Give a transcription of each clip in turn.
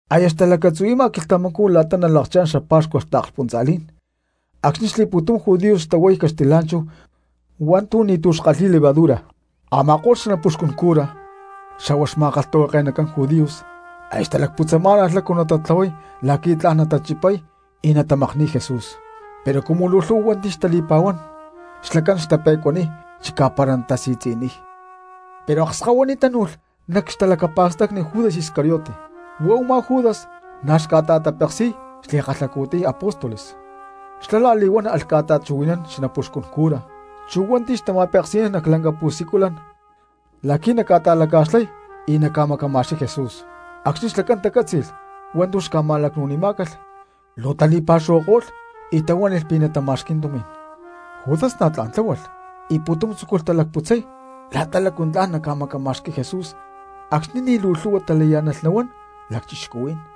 Aya xlacatzu̠huanama quilhtamacú la̠ta nalakchá̠n xapa̠xcua taakspuntza̠lí̠n acxni̠ xli̠pu̠tum judíos xtahuay caxtilá̠nchahu hua̠ntu̠ ni̠tu̠ kalhi̠y levadura. Ama̠ko̠lh xanapuxcun cura xa̠hua xma̠kalhtahuake̠nacán judíos aya xtalacputzamá̠nalh lácu natatlahuay la̠qui̠ tla̠n natachipay y natamakni̠y Jesús. Pero cumu luu lhu̠hua cristianos xtali̠pa̠huá̠n xlacán xtape̠cuaniy chicá para natasi̠tzi̠niy. Pero akskahuiní tánu̠lh nac xtalacapa̠stacni Judas Iscariote; huá u̠má Judas na̠ xca̠ta̠tapeksi̠y xli̠kalhacu̠tiy apóstoles. Xlá la̠li̠huán alh ca̠ta̠chuhui̠nán xanapuxcun cura chu hua̠nti̠ xtama̠peksi̠nán nac lanca pu̠siculan la̠qui̠ naca̠ta̠laca̠xlay y naca̠macama̠xqui̠y Jesús. Acxni̠ xlacán tacátzi̠lh hua̠ntu̠ xca̠ma̠lacnu̠nimá̠calh luu tali̠pa̠xuhuako̠lh y tahuánilh pi̠ natama̠xqui̠y tumi̠n. Judas na̠ tla̠n tláhualh y pu̠tum tzúculh talacputzay la̠ta lácu tla̠n naca̠macama̠xqui̠y Jesús acxni̠ ni̠ luu lhu̠hua talayá̠nalh nahuán cristianos.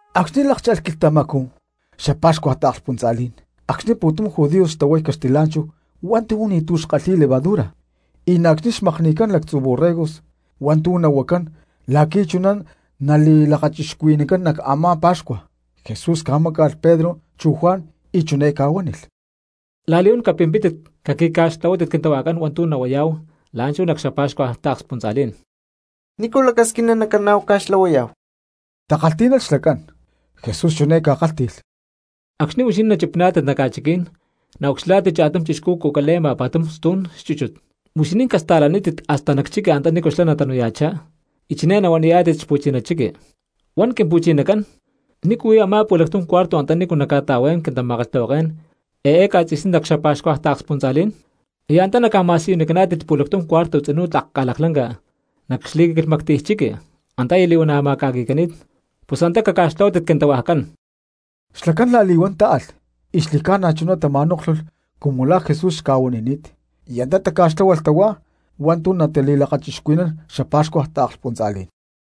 Acxni̠ lákcha̠lh quilhtamacú cxapa̠xcua taakspuntza̠lí̠n, acxni̠ pu̠tum judíos xtahuay caxtilá̠nchahu hua̠ntu̠ ni̠tu̠ kalhi̠y levadura, y na̠ acxni̠ xca̠makni̠cán xalactzu borregos hua̠ntu̠ nahuacán la̠qui̠ chuná nali̠lakachixcuhui̠nancán nac a̠má pa̠xcua, Jesús ca̠máca̠lh Pedro chu Juan y chiné ca̠huánilh: —La̠li̠huán capimpítit caqui̠ca̠xtlahuátit quintahuajcán hua̠ntu̠ nahuayá̠hu la̠nchú nac xapa̠xcua taakspuntza̠lí̠n. —¿Nícu lacasquina nacana̠huá ca̠xtlahuayá̠hu? —takalhtí̠nalh xlacán. Jesús chiné ca̠kálhti̠lh: —Acxni̠ huixinín nachipiná̠tit nac ca̠chiquí̠n, naucxilhá̠tit cha̠tum chixcú cucale̠ma pa̠tum stu̠n chúchut. Huixinín casta̠lanítit hasta nac chiqui antanícu xlá natanu̠ya̠chá, y chiné nahuaniyá̠tit xpu̠chiná chiqui: “Huan Quimpu̠chinacán: ¿Nícu huí a̠má pu̠lactum cuarto antanícu nacca̠ta̠hua̠yán quintama̠kalhtahuaké̠n eé ca̠tzi̠sní nac xapa̠xcua taakspuntza̠lí̠n?” Y antá naca̠ma̠siyunicaná̠tit pu̠lactum cuarto tzinú tlak ca̠laklanca nac xli̠quilhmactiy chiqui, antá aya li̠huana̠ ma̠ca̠qui̠cani̠t; pus antá caca̠xtlahuátit quintahuajcán. Xlacán la̠li̠huán táalh y xli̠cána chuná tama̠nóklhulh cumu la̠ Jesús xca̠huanini̠t, y antá taca̠xtláhualh tahuá hua̠ntu̠ natali̠lakachixcuhui̠nán xapa̠xcua taakspuntza̠lí̠n.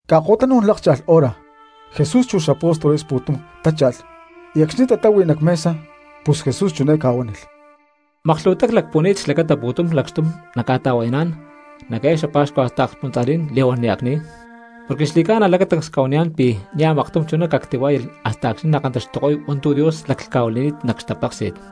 Ca̠ko̠tanú̠n lákcha̠lh hora Jesús chu xapóstoles pu̠tum tácha̠lh; y acxni̠ tatáhui nac mesa, pus Jesús chiné ca̠huánilh: —Maklhu̠huatá clacpuhuani̠t xlacata pu̠tum lacxtum nacca̠ta̠hua̠yaná̠n nac eé xapa̠xcua taakspuntza̠lí̠n li̠huán nia̠ cni̠y. Porque xli̠ca̠na lacatancs cca̠huaniyá̠n pi̠ niaj maktum chuná cactihuá̠yalh hasta acxni̠ nakantaxtuko̠y hua̠ntu̠ Dios laclhca̠huili̠ni̠t nac xtapéksi̠t.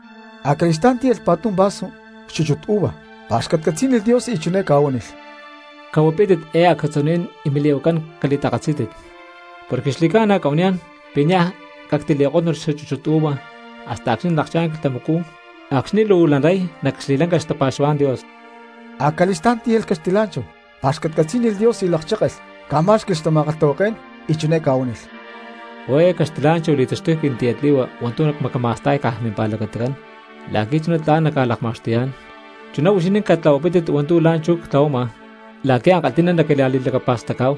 Acali̠stá̠n tíyalh pa̠tum vasu xchúchut uva, pa̠xcatcatzí̠nilh Dios, y chiné ca̠huánilh: —Cahuapítit eé acatzuní̠n y mili̠hua̠kcán cali̠takatzí̠tit. Porque xli̠cána cca̠huaniyá̠n pi̠ niaj cactili̠kótnulh xchúchut uva hasta acxni̠ nalakchá̠n quilhtamacú acxni̠ luu nalay nac xli̠ca̠lanca xtapa̠xuhuá̠n Dios. Acali̠stá̠n tíyalh caxtilá̠nchahu, pa̠xcatcatzí̠nilh Dios y lakchékelh, ca̠má̠xqui̠lh xtama̠kalhtahuaké̠n y chiné ca̠huánilh: —Huá eé caxtilá̠nchahu li̠taxtuy quintiyatli̠hua hua̠ntu̠ cmacama̠sta̠y caj mimpa̠lacatacán la̠qui̠ chuná tla̠n nacca̠lakma̠xtuyá̠n. Chuná huixinín catlahuapítit hua̠ntu̠ la̠nchú ctlahuama la̠qui̠ ankalhi̠ná naquila̠li̠lacapa̠stacá̠hu.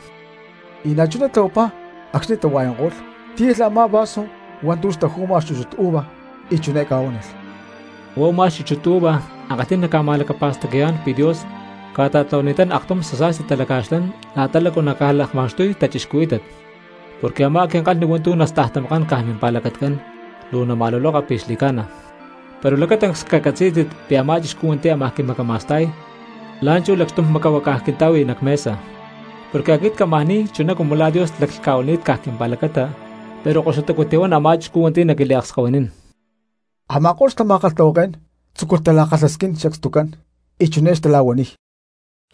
Y na̠chuná tlahuapá acxni̠ tahua̠yanko̠lh, tíyalh a̠má vasu hua̠ntu̠ xpu̠taju̠ma xchúchut uva, y chiné ca̠huánilh: —Huá u̠má xchúchut uva ankalhí̠n naca̠ma̠lacapa̠stacayá̠n pi̠ Dios ca̠ta̠tlahuani̠tán aktum xasa̠sti talaca̠xlán la̠ta lácu naca̠lakma̠xtuy cristianos, porque a̠má quinkalhni hua̠ntu̠ nastajtamakán caj mimpa̠lacatacán luu nama̠luloka pi̠ xli̠ca̠na. Pero lacatancs cacatzí̠tit pi̠ a̠má chixcú hua̠nti̠ ámaj quimacama̠sta̠y la̠nchú lacxtum macahuácaj quinta̠hui nac mesa. Porque aquit cámaj ni̠y chuná cumu la̠ Dios laclhca̠huili̠ni̠t caj quimpa̠lacata, pero koxutacú tihuán a̠má chixcú hua̠nti̠ naquiliakskahuinín. Ama̠ko̠lh xtama̠kalhtahuaké̠n tzúculh tala̠kalhasquín sacstucán y chiné xtala̠huaniy: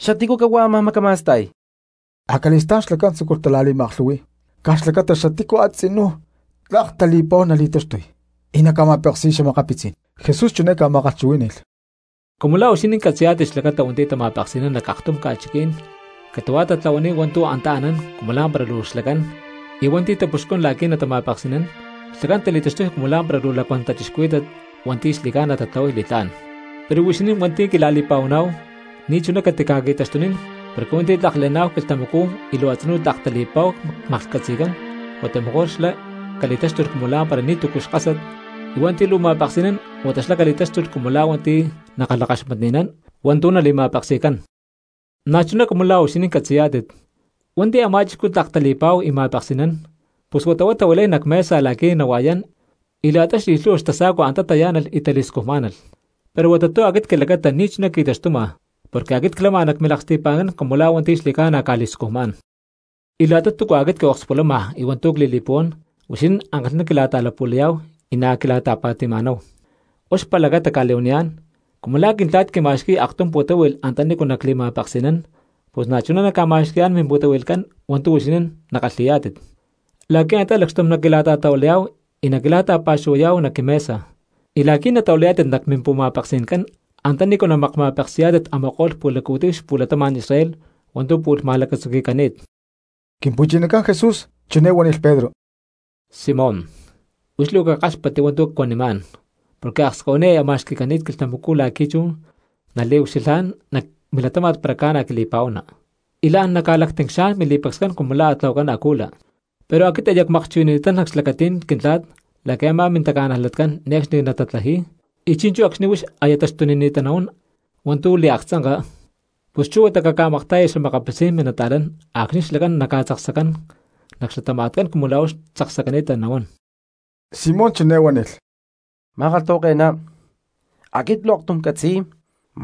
—¿Xatícu cahuá ámaj macama̠sta̠y? Acali̠stá̠n xlacán tzúculh tala̠li̠ma̠aklhu̠hui̠y caj xlacata xatícu a̠tzinú tlak tali̠pa̠huá nali̠taxtuy y naca̠ma̠peksi̠y xa̠makapitzí̠n. Jesús chiné ca̠ma̠kalhchuhuí̠ni̠lh: —Cumu la̠ huixinín catzi̠yá̠tit xlacata hua̠nti̠ tama̠peksi̠nán nac aktum ca̠chiquí̠n catu̠huá tatlahuaniy hua̠ntu̠ antá anán cumu lá̠mpara luu xlacán, y hua̠nti̠ tapuxcún la̠qui̠ natama̠peksi̠nán, xlacán tali̠taxtuy cumu lá̠mpara luu lacuán cristianos hua̠nti̠ xli̠ca̠na tatlahuay li̠tlá̠n. Pero huixinín hua̠nti̠ quila̠li̠pa̠huaná̠hu ni̠chuná catica̠qui̠taxtunín porque hua̠nti̠ tlak le̠ná̠hu quilhtamacú y luu a̠tzinú tlak tali̠pa̠huá maklhcatzi̠cán huata mejor xlá cali̠táxtulh cumu lá̠mpara ni̠tu̠cu xkásat; y hua̠nti̠ luu ma̠peksi̠nán huata xlá cali̠táxtulh cumu la̠ hua̠nti̠ nakalhakaxmatni̠nán hua̠ntu̠ nali̠ma̠peksi̠cán. Na̠chuná cumu la̠ huixinín catzi̠yá̠tit, hua̠nti̠ a̠má chixcú tlak tali̠pa̠hu y ma̠peksi̠nán, pus huata huá tahuilay nac mesa la̠qui̠ nahua̠yán y la̠ta xli̠lhu̠hua xtasa̠cua antá tayá̠nalh y tali̠scujmá̠nalh. Pero huata tu̠ aquit quilacata ni̠chuná qui̠taxtuma porque aquit clama nac milaksti̠pa̠ncán cumu la̠ hua̠nti̠ xli̠ca̠na ca̠li̠scujmá̠n. ’Y la̠ta túcua aquit quiokspulama y hua̠ntu̠ cli̠li̠puhuán huixinín ankalhi̠ná quila̠ta̠lapu̠layá̠hu y na̠ quila̠ta̠pa̠ti̠ma̠náhu. Huá xpa̠lacata cca̠li̠huaniyá̠n, cumu la̠ Quintla̠t quima̠xqui̠y aktum pu̠táhui̠lh antanícu nacli̠ma̠peksi̠nán pus na̠chuná nacca̠ma̠xqui̠yá̠n mimpu̠tahui̠lhcán hua̠ntu̠ huixinín nakalhi̠yá̠tit, la̠qui̠ antá lacxtum naquila̠ta̠hua̠yaná̠hu y naquila̠ta̠pa̠xuhuayá̠hu nac quimesa, y la̠qui̠ natahuilayá̠tit nac mimpu̠ma̠peksi̠ncán antanícu namakma̠peksi̠yá̠tit a̠ma̠ko̠lh pu̠laccu̠tiy xapu̠latama̠n Israel hua̠ntu̠ pu̠lh ma̠lacatzuqui̠cani̠t. Quimpu̠chinacán Jesús chiné huánilh chú Pedro: —Simón, huix luu cakáxpatti hua̠ntu̠ cuanimá̠n porque akskahuiní aya ma̠xqui̠cani̠t quilhtamacú la̠qui̠ chú naliucxilhá̠n nac milatáma̠t para ca̠na quili̠pa̠huana, y la̠n naca̠lactincxá̠n mili̠pacscán cumu la̠ a̠ tlahuacán acula. Pero aquit aya cca̠makchuhui̠nani̠tán nac xlacatí̠n Quintla̠t la̠qui̠ a̠má mintaca̠najlatcán ne̠cxni natatlaji̠y, y chi̠nchú acxni̠ huix aya taxtunini̠ta nahuán hua̠ntu̠ liaktzanka, pus chú huata caca̠makta̠ya xa̠makapitzí̠n minta̠cristianos acxni̠ xlacán na̠ naca̠tzaksacán nac xlatama̠tcán cumu la̠ huix tzaksacani̠ta nahuán. Simón chiné huánilh: —Ma̠kalhtahuake̠ná, aquit luu aktum ccatzi̠y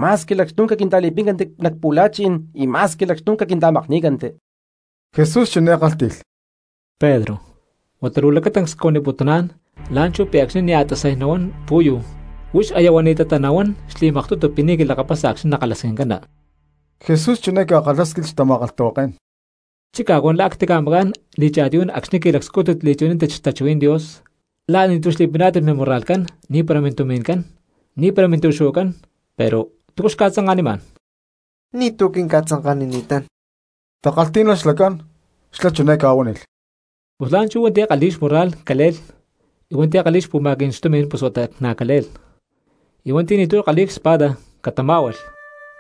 ma̠squi lacxtum caquinta̠li̠píncanti nac pu̠la̠chi̠n y ma̠squi lacxtum quinta̠makní̠canti. Jesús chiné kálhti̠lh: —Pedro, huata luu lacatancs cuaniputuná̠n la̠nchú pi̠ acxni̠ nia̠ tasay nahuán pu̠yu huix aya huani̠tatá nahuán xli̠maktutu pi̠ ni̠ quilakapasa acxni̠ nakalhasquincana. Jesús chiné ca̠kalhásquilh xtama̠kalhtahuaké̠n: —Chicá cuan la̠ a̠ ctica̠macá̠n li̠cha̠tiyú̠n acxni̠ qui̠lacscújtit li̠chuhui̠nántit xtachuhuí̠n Dios, la̠ a̠ ni̠tu̠ xli̠piná̠tit mimurra̠lhcán, ni̠para mintumi̠ncán, ni̠para mintu̠xu̠huacán, pero ¿túcu xca̠tzanka̠nimá̠n? —Ni̠tu̠ quinca̠tzanka̠nini̠tán —takalhtí̠nalh xlacán. Xlá chiné ca̠huánilh: —Pus chú la̠nchú hua̠nti̠ kalhi̠y xmúrra̠lh cale̠lh; y hua̠nti̠ kalhi̠y xpu̠ma̠qui̠cán xtumi̠n pus huata na̠ cale̠lh; y hua̠nti̠ ni̠tu̠ kalhi̠y xespada catamá̠hualh,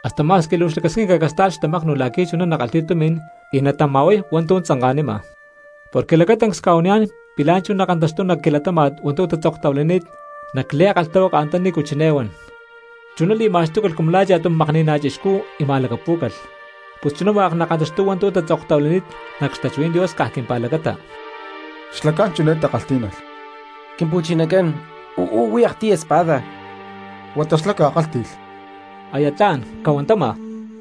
hasta ma̠squi luu xlacasquinca casta̠lh xtamaknu la̠qui̠ chuná nakalhi̠y tumi̠n y natama̠huay hua̠ntu̠ tzanka̠nima. Porque lacatancs cca̠huaniyá̠n pi̠ la̠nchú nakantaxtuy nac quilatáma̠t hua̠ntu̠ tatzoktahuilani̠t nac li̠kalhtahuaka antanícu chiné huan: “Chuná li̠ma̠xtúcalh cumu la̠ cha̠tum makni̠ná chixcú y ma̠lacapú̠calh.” Pus chuná hua̠k nakantaxtuy hua̠ntu̠ tatzoktahuilani̠t nac xtachuhuí̠n Dios caj quimpa̠lacata. Xlacán chiné takalhtí̠nalh: —Quimpu̠chinacán, uú huí aktiy espada. Huata xlá ca̠kálhti̠lh: —Aya tla̠n cahuantama.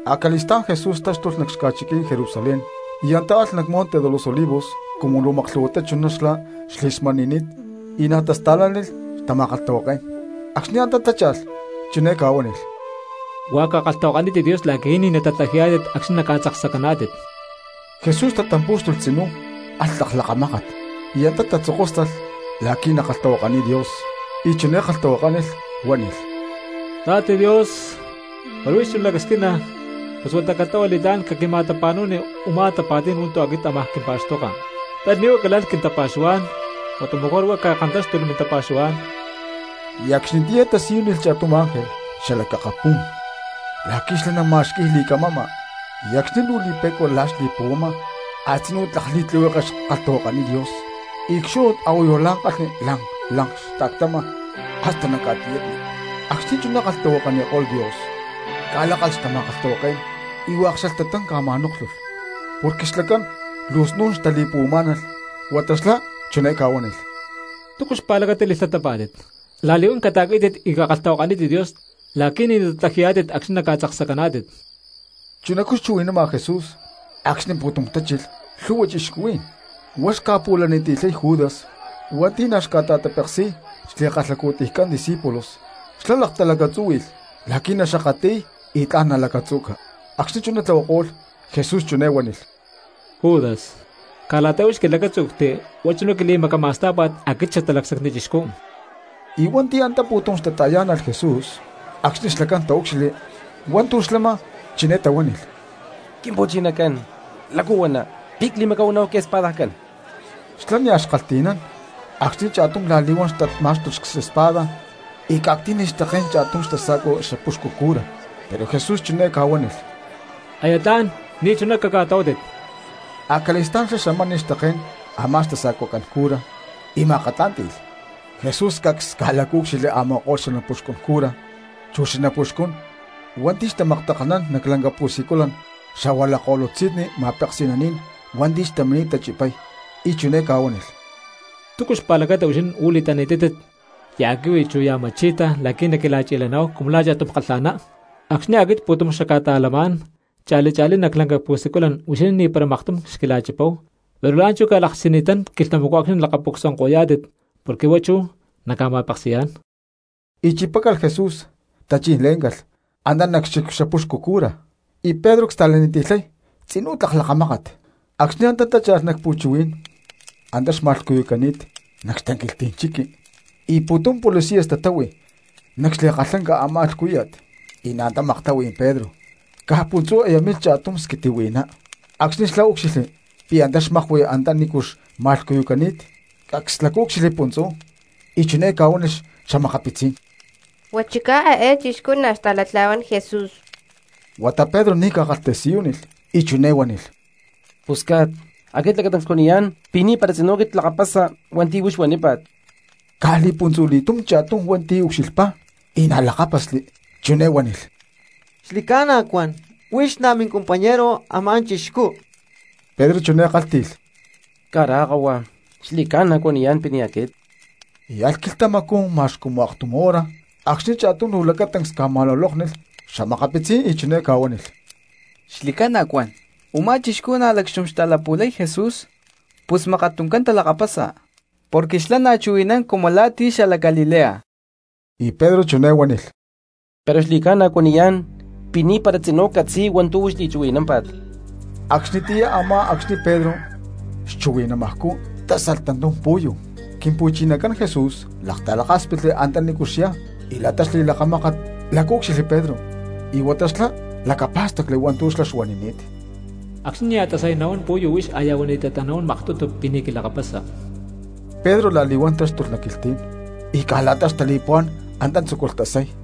Acali̠stá̠n Jesús táxtulh nac xaca̠chiquí̠n Jerusalén y antá alh nac Monte de los Olivos cumu la̠ maklhu̠huatá chuná xlá xli̠smani̠ni̠t y na̠ tasta̠lánilh xtama̠kalhtahuaké̠n. Acxni̠ antá tácha̠lh chiné ca̠huánilh: —Hua̠k cakalhtahuakanítit Dios la̠qui̠ ni̠ natatlaji̠yá̠tit acxni̠ naca̠tzaksacaná̠tit. Jesús tatampú̠xtulh tzinú alh tlak lakamákat y antá tatzokóstalh la̠qui̠ nakalhtahuakaniy Dios, y chiné kalhtahuakánilh huánilh: —Papá Dios, para huix chuná lacasquina pus huata catlahua li̠tlá̠n caquima̠tapa̠nu̠ni u̠má tapa̠tí̠n hua̠ntu̠ aquit ámaj quimpa̠xtoka. Pero ni̠ huá calalh quintapa̠xuhuá̠n huata mejor huá cakantáxtulh mintapa̠xuhuá̠n. Y acxnitiyá tasiyúnilh cha̠tum ángel xalac akapú̠n la̠qui̠ xlá nama̠xqui̠y li̠camama. Y acxni̠ luu li̠pe̠cua la̠ xli̠puhuama a̠tzinú tlak li̠tlihueke xkalhtahuakaniy Dios y cxúnut a̠huayu la̠ kalhni lank lank xta̠ctama hasta nac ca̠tiyatni. Acxni̠ chuná kalhtahuakaniko̠lh Dios ca̠lákalh xtama̠kalhtahuaké̠n y hua̠k xalhtatán ca̠ma̠nóklhulh, porque xlacán luu snu̠n xtali̠puhuamá̠nalh. Huata xlá chiné ca̠huánilh: —¿Túcu xpa̠lacata li̠lhtatapá̠tit? La̠li̠huán cata̠quí̠tit y cakalhtahuakanítit Dios la̠qui̠ ni̠ natatlaji̠yá̠tit acxni̠ ca̠tzaksacaná̠tit. Chunacú xchuhui̠nama Jesús acxni̠ pu̠tum tachilh lhu̠hua cristianos. Huá xca̠pu̠laniti̠lhay Judas hua̠nti̠ na̠ xca̠ta̠tapeksi̠y xli̠kalhacu̠tiycán discípulos. Xlá laktalacatzúhui̠lh la̠qui̠ naxakatli̠y y tla̠n nalacatzu̠ca. Acxni̠ chuná tlahuako̠lh, Jesús chiné huánilh: —Judas, ¿caj la̠ta huix quilacátzu̠cti huá chuná quili̠macama̠stá̠pa̠t aquit Xatalacsacni Chixcú? Y hua̠nti̠ antá pu̠tum xtata̠yá̠nalh Jesús acxni̠ xlacán taúcxilhli hua̠ntu̠ xlama chiné tahuánilh: —Quimpu̠chinacán, ¿lácu huana, pi̠ cli̠macahuaná̠hu quiespadajcán? Xlá nia̠ xkalhti̠nán acxni̠ cha̠tum la̠li̠huán xtat má̠xtulh xespada y ca̠ctí̠nilh xtaké̠n cha̠tum xtasa̠cuacán xapuxcu cura. Pero Jesús chiné ca̠huánilh: —Aya tla̠n ni̠chuná caca̠tlahuátit. Acali̠stá̠n xlá xamánilh xtaké̠n a̠má xtasa̠cuacán cura y ma̠akatlá̠nti̠lh. Jesús cacs ca̠lacaúcxilhli a̠ma̠ko̠lh xanapuxcun cura chu xanapuxcún hua̠nti̠ xtamaktakalhnán nac lanca pu̠siculan xa̠hua lakko̠lutzi̠nni ma̠peksi̠naní̠n hua̠nti̠ xtamini̠t tachipay, y chiné ca̠huánilh: —¿Túcu xpa̠lacata huixinín uú li̠tani̠tátit ya̠ quihui chu ya̠ ma̠chi̠ta la̠qui̠ naquila̠chi̠le̠ná̠hu cumu la̠ cha̠tum kalha̠ná? Acxni̠ aquit pu̠tum xacca̠ta̠lamá̠n cha̠li cha̠lí nac lanca pu̠siculan huixinín ni̠para maktum xquila̠chipáhu, pero la̠nchú ca̠lakchini̠tán quilhtamacú acxni̠ nalakaca̠pucsuananko̠yá̠tit porque huá chú naca̠ma̠peksi̠yá̠n. Y chipácalh Jesús, tachí̠n lé̠ncalh antá nac xchic xapuxcu cura, y Pedro csta̠laniti̠lhay tzinú tlak lakamákat. Acxni̠ antá tácha̠lh nac pu̠chuhuí̠n antá ma̠lhcuyúcalh nac xtanquilhtí̠n chiqui y pu̠tum policías tatáhui nac xli̠kalhlanca a̠má lhcúya̠t, y na̠ antá maktáhui Pedro. Caj puntzú aya milh cha̠tum squitihui̠ná; acxni̠ xlá úcxilhli pi̠ antá xmaklahui antanícu xma̠lhcuyucani̠t, cacs lacaúcxilhli puntzú y chiné ca̠huánilh xa̠makapitzí̠n: —Huá chicá eé chixcú na̠ xta̠latla̠huán Jesús. Huata Pedro ni̠ ca̠kalhtasiyúnilh y chiné huánilh: —Pusca̠t, aquit lacatancs cuaniyá̠n pi̠ ni̠para tzinú clakapasa hua̠nti̠ huix huanípa̠t. Caj li̠puntzu̠li̠túm cha̠tum hua̠nti̠ ucxilhpá y na̠ lakápasli, chiné huánilh: —Xli̠ca̠na cuan huix na̠ mincompañero a̠má chixcú. Pedro chiné huánilh: —Cará kahua, xli̠ca̠na cuaniyá̠n pi̠ ni̠ aquit. Y alh quilhtamacú ma̠x cumu aktum hora acxni̠ cha̠tum luu lacatancs ca̠ma̠lulóknilh xa̠makapitzí̠n y chiné ca̠huánilh: —Xli̠ca̠na cuan, u̠má chixcú na̠ lacxtum xta̠lapu̠lay Jesús, pus mákat tuncán talakapasa porque xlá na̠ chuhui̠nán cumu la̠ ti̠ xalac Galilea. Y Pedro chiné huánilh: —Pero xli̠ca̠na cuaniyá̠n pi̠ ni̠para tzinú ccatzi̠y hua̠ntu̠ li̠chuhui̠námpa̠t. Acxnitiyá a̠má acxni̠ Pedro xchuhui̠namajcú tásalh tantum pu̠yu. Quimpu̠chinacán Jesús laktalakáspitli antanícu xyá y la̠ta xli̠lakamákat lacaúcxilhli Pedro, y huata xlá lacapá̠stacli hua̠ntu̠ xlá xuanini̠t: “Acxni̠ nia̠ tasay nahuán pu̠yu huix aya huani̠tatá nahuán maktutu pi̠ ni̠ quilakapasa.” Pedro la̠li̠huán táxtulh nac quilhtí̠n y caj la̠ta xtali̠puhuá̠n antá tzúculh tasay.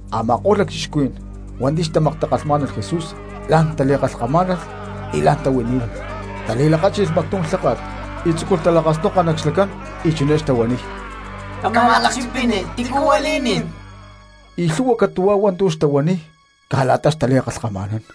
Ama̠ko̠lh lacchixcuhuí̠n hua̠nti̠ xtamaktakalhmá̠nalh Jesús la̠n tali̠kamá̠nalh y la̠n tahuilí̠nilh. Tali̠lakáchi̠lh mactum lháka̠t y tzúculh talakasnoka nac xlacán y chiné xtahuaniy: —Cama̠lakchipini tícu huili̠nín. Y lhu̠hua catu̠huá hua̠ntu̠ xtahuaniy caj la̠ta xtali̠kalhkama̠nán.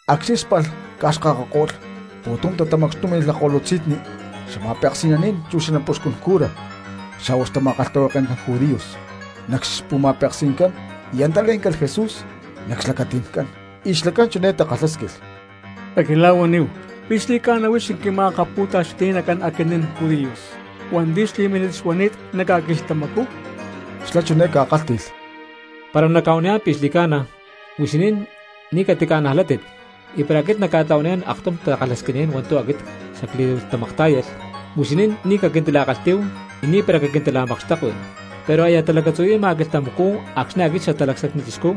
Acxni̠ spalh ca̠xkakako̠lh pu̠tum tatamacxtúmi̠lh xalakko̠lutzi̠nni ma̠peksi̠naní̠n chu xanapuxcún cura, xa̠huá xma̠kalhtahuake̠nacán judíos nac xpu̠ma̠peksi̠ncán y antá lé̠ncalh Jesús nac xlacati̠ncán, y xlacán chiné takalhásquilh: —Caquila̠huaníhu, ¿pi̠ xli̠ca̠na huix quima̠akapu̠taxti̠nacán aquinín judíos hua̠nti̠ xli̠mínit xuani̠t nac ca̠quilhtamacú? Xlá chiné ca̠kálhti̠lh: —Para nacca̠huaniyá̠n pi̠ xli̠ca̠na, huixinín ni̠ catica̠najlátit. Y para aquit nacca̠tlahuaniyá̠n aktum takalhasquiní̠n hua̠ntu̠ aquit xacli̠tamaktá̠yalh, huixinín ni̠ caquintila̠kalhtí̠hu, y ni̠para quintila̠makxtekui. Pero aya talacatzuhui̠ma quilhtamacú acxni̠ aquit Xatalacsacni Chixcú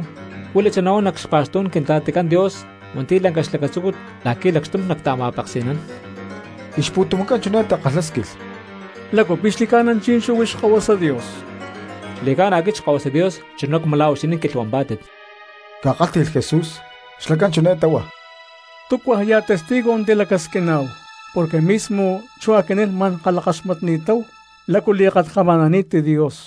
cuilachá nahuán nac xpa̠xtú̠n Quintla̠ticán Dios hua̠nti̠ lanca xlacatzúcut la̠qui̠ lacxtum nacta̠ma̠peksi̠nán. Y xpu̠tumcán chiné takalhásquilh: —¿Lácu pi̠ xli̠ca̠na chi̠nchú huix Xkahuasa Dios? —Xli̠ca̠na aquit Xkahuasa Dios chuná cumu la̠ huixinín quilhuampá̠tit —ca̠kálhti̠lh Jesús. Xlacán chiné táhua: —¿Túcuaj ya̠ testigo tilacasquiná̠hu? Porque mismo chú aquinín ma̠n kalhakaxmatni̠táhu lácu li̠kalhkama̠nani̠t Dios.